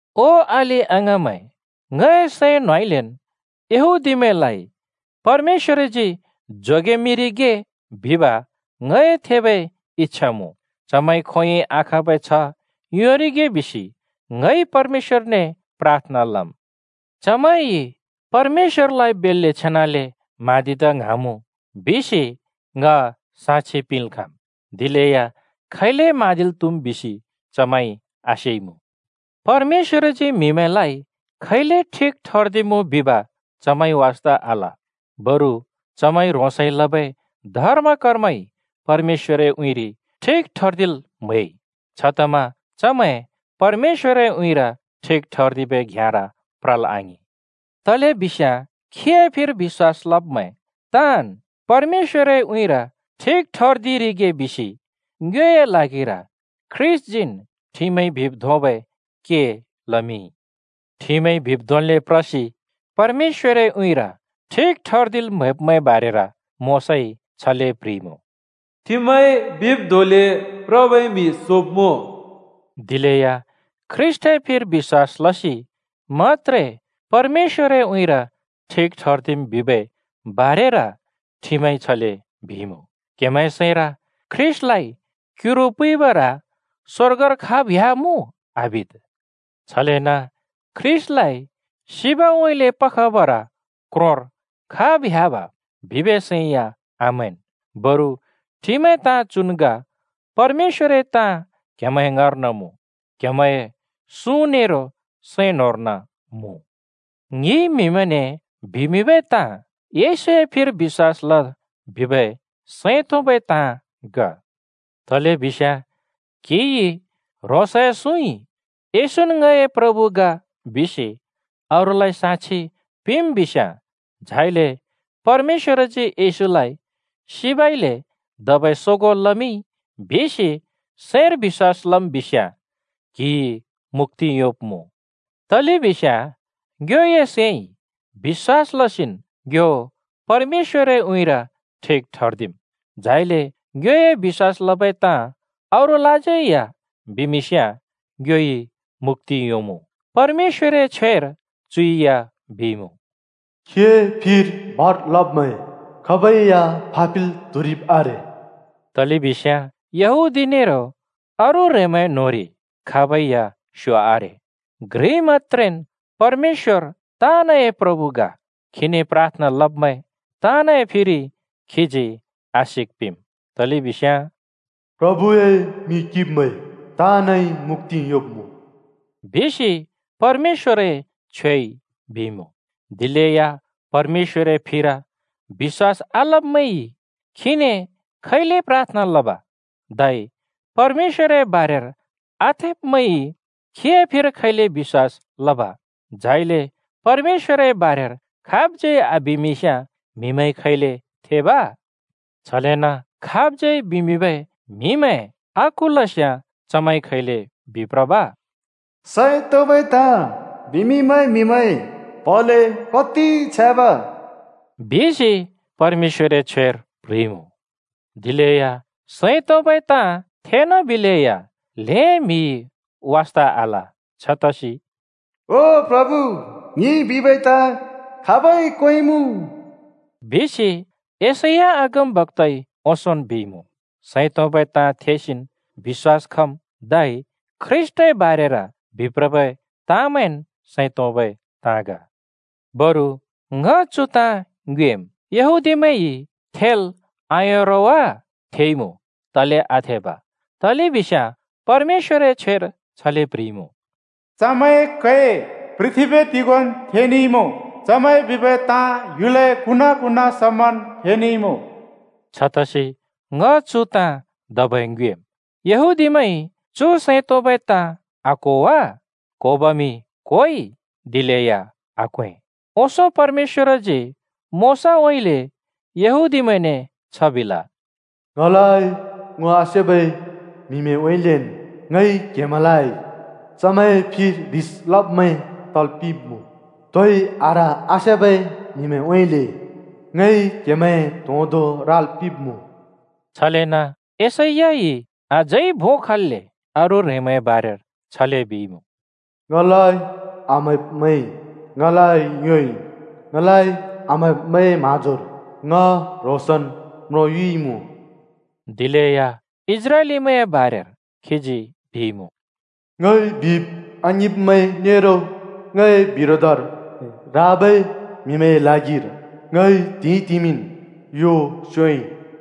ओ अलि-अङाँमैं, ङए सैं न्‍होंउँइँलेन् यहूदीमैंलाइ परमेश्‍वरजी जोगेमिंरिगे बिब ङए थेबै इच्छा मुँ, चमैंइ खोंयोंइ आखाँबै छ्ह योंरिगे बिसि ङइ परमेश्‍वरने प्राथना लम्। चमैंइ परमेश्‍वरलाइ बेल्‍ले छेनाले म्हाँदिदा ङ्हाँमुँ बिसि ङ साक्षि पिंल् खाँम्; दिलेया खैले म्हाँदिल् त्हुम् बिसि चमैंइ आसेइमुँ। परमेश्‍वरजी म्हिलाइ खैले ठिक ठर्दिमुँ बिब चमैंइ वास्ता आल, बरु चमैंइ ह्रोंसइ लबै धर्म-कर्मइ परमेश्‍वरए उँइँरि ठिक ठर्दिल् म्‍हैइ। छतमा चमैं परमेश्‍वरए उँइँर ठिक ठर्दिबै घ्याँर प्रल् आङिं। तलेबिस्याँ खीए फिर बिश्‍वास लब्मैं ताँन् परमेश्‍वरए उँइँर ठिक ठर्दिरिगे बिसि ङ्योए ल्हागिर ख्रीष्‍टजीन् ठिमइ बिब् धोंबै के लमिंइ। ठिमइ बिब् धोंले प्रसि परमेश्‍वरए उँइँर ठिक ठर्दिल् म्हैब्मैंए बारेर मोशाइ छले प्‍ह्रिइमुँ, “ठिमइ बिब् धोंले प्रबै म्‍हि सोब्मुँ।” दिलेया ख्रीष्‍टए फिर बिश्‍वास लसि मत्‍त्रे परमेश्‍वरए उँइँर ठिक ठर्दिम् बिबै बारेर ठिमइ छले बिइमुँ, “क्हेमैंए सैंर ‘ख्रीष्‍टलाइ क्युरु पुइबर स्‍वर्गर खाब् ह्‍यामुँ?’ आबिद्। छलेन ‘ख्रीष्‍टलाइ सिबउँइँले पखबर क्रोंर खाब् ह्‍याब?’ बिबै सैं या आमैंन्।” बरु ठिमए ताँ चु ग, “परमेश्‍वरए ताँ क्‍हेमैंए ङाँर्न मुँ। क्‍हेमैंए सुँ नेरो सैं न्‍होंर्न मुँ।” ङिइ म्हिमैंने बिमिंबै ताँ: येशूए फिर बिश्‍वास लद् बिबै सैं तोंबै ताँ ग। तलेबिस्याँ क्‍हिइ ह्रोंसए सुँइ “येशून् ङए प्रभु ग” बिसि अरूलाइ साक्षि पिंम् बिस्‍याँ, झाइले “परमेश्‍वरजी येशूलाइ सिबइले धबै सोगों लमिंइ” बिसि सैंर बिश्‍वास लम् बिस्‍याँ क्‍हिइ मुक्‍ति योंब्‍मुँ। तलेबिस्याँ ङ्योए सैंइ बिश्‍वास लसिन् ङ्यो परमेश्‍वरए उँइँर ठिक ठर्दिम्, झाइले ङ्योए बिश्‍वास लबै ताँ अरूलाज्यै या बिमिंस्याँ ङ्योइ मुक्‍ति योंमुँ। परमेश्‍वरए छ्वेर चु या बिइमुँ, “खीए फिर भर लब्मैं खाबै या फापिल् त्हुरिब् आरे।” तलेबिस्याँ यहूदी नेरो अरू ह्रेंमैंए न्‍होंरि खाबै या स्यो आरे। घ्रि मत्‍त्रेन् परमेश्‍वर ताँनए प्रभु ग। खीने प्राथना लब्‍मैं ताँनए फिर खीजी आशिक पिंम्। तलेबिस्याँ “प्रभुए मिं किंब्‍मैं ताँनइ मुक्‍ति योंब्‍मुँ,” बिसि परमेश्‍वरए छ्वेइ बिइमुँ। दिलेया परमेश्‍वरए फिर बिश्‍वास आलब्‍मैंइ खीने खैले प्राथना लब? धै परमेश्‍वरए बारेर आथेब्‍मैंइ खीए फिर खैले बिश्‍वास लब? झाइले परमेश्‍वरए बारेर खाबज्‍यै आबिमिंस्‍याँ म्‍हिमैंइ खैले थेब? छलेन खाबज्‍यै बिमिंबै म्‍हिमैं आकुलस्‍याँ चमैंइ खैले बिप्रब? “सैं तोंबै ताँ बिमिंबै म्हिमैंए प्हले कति छ्याँब,” बिसि परमेश्‍वरए छ्वेर प्ह्रिइमुँ। दिलेया सैं तोंबै ताँ थेनाबिलेया ल्हें म्हिइ वास्‍था आल। छतसि “ओ प्रभु, ङिइ बिबै ताँ खाबै क्‍वेंइमुँ?” बिसि यशैया अगमबक्‍ताइ ओंसोंन् बिइमुँ। सैं तोंबै ताँ थेसिन् बिश्‍वास खम्, धै ख्रीष्‍टए बारेर बिप्रबै ताँमैंन् सैं तोंबै ताँ ग। बरु ङ चु ताँ ङ्योएम्: यहूदीमैंइ थेल् आयों रो वा? थेइमुँ, तले आथेब! तलेबिस्याँ परमेश्‍वरए छ्वेर छले प्ह्रिइमुँ: “चमैंए कै पृथ्‍बी तिगोंन् थेनेइमुँ, चमैंइ बिबै ताँ ह्‍युलए कुना-कुना समन् फेनेइमुँ।” छतसि ङ चु ताँ धबै ङ्योएम्: यहूदीमैंइ चु सैं तोंबै ताँ आक्हो वा? क्होबमि क्होइ दिलेया आक्‍वें। ओंसों परमेश्‍वरजी मोशाउँइँले यहूदीमैंने छ बिल, “ङलाइ ङो आसेबै म्हिमैंउँइँलेन् ङइ क्‍हेमैंलाइ चमैंए फिर ह्रिस लब्मैं तल् पिंब्मुँ, तोइ आह्र आसेबै म्‍हिमैंउँइँलेन् ङइ क्‍हेमैंए त्होंदो राल् पिंब्‍मुँ।” छलेन यशैयाइ अझै भों खल्‍ले अरू ह्रेंमैंए बारेर छले बिइमुँ, “ङलाइ आम्‍हैब्‍मैंइ ङलाइ योंइ, ङलाइ आम्हैब्मैंए म्हाँजोर ङ ह्रोंसन् म्रोंयुइमुँ।” दिलेया इस्राएलीमैंए बारेर खीजी बिइमुँ, “ङइ बिब् आङिंब्मैं नेरो ङए बिरोधर राबै म्हिमैंए ल्हागिर ङइ त्हिंइतिमिन् यो स्‍योंइ।”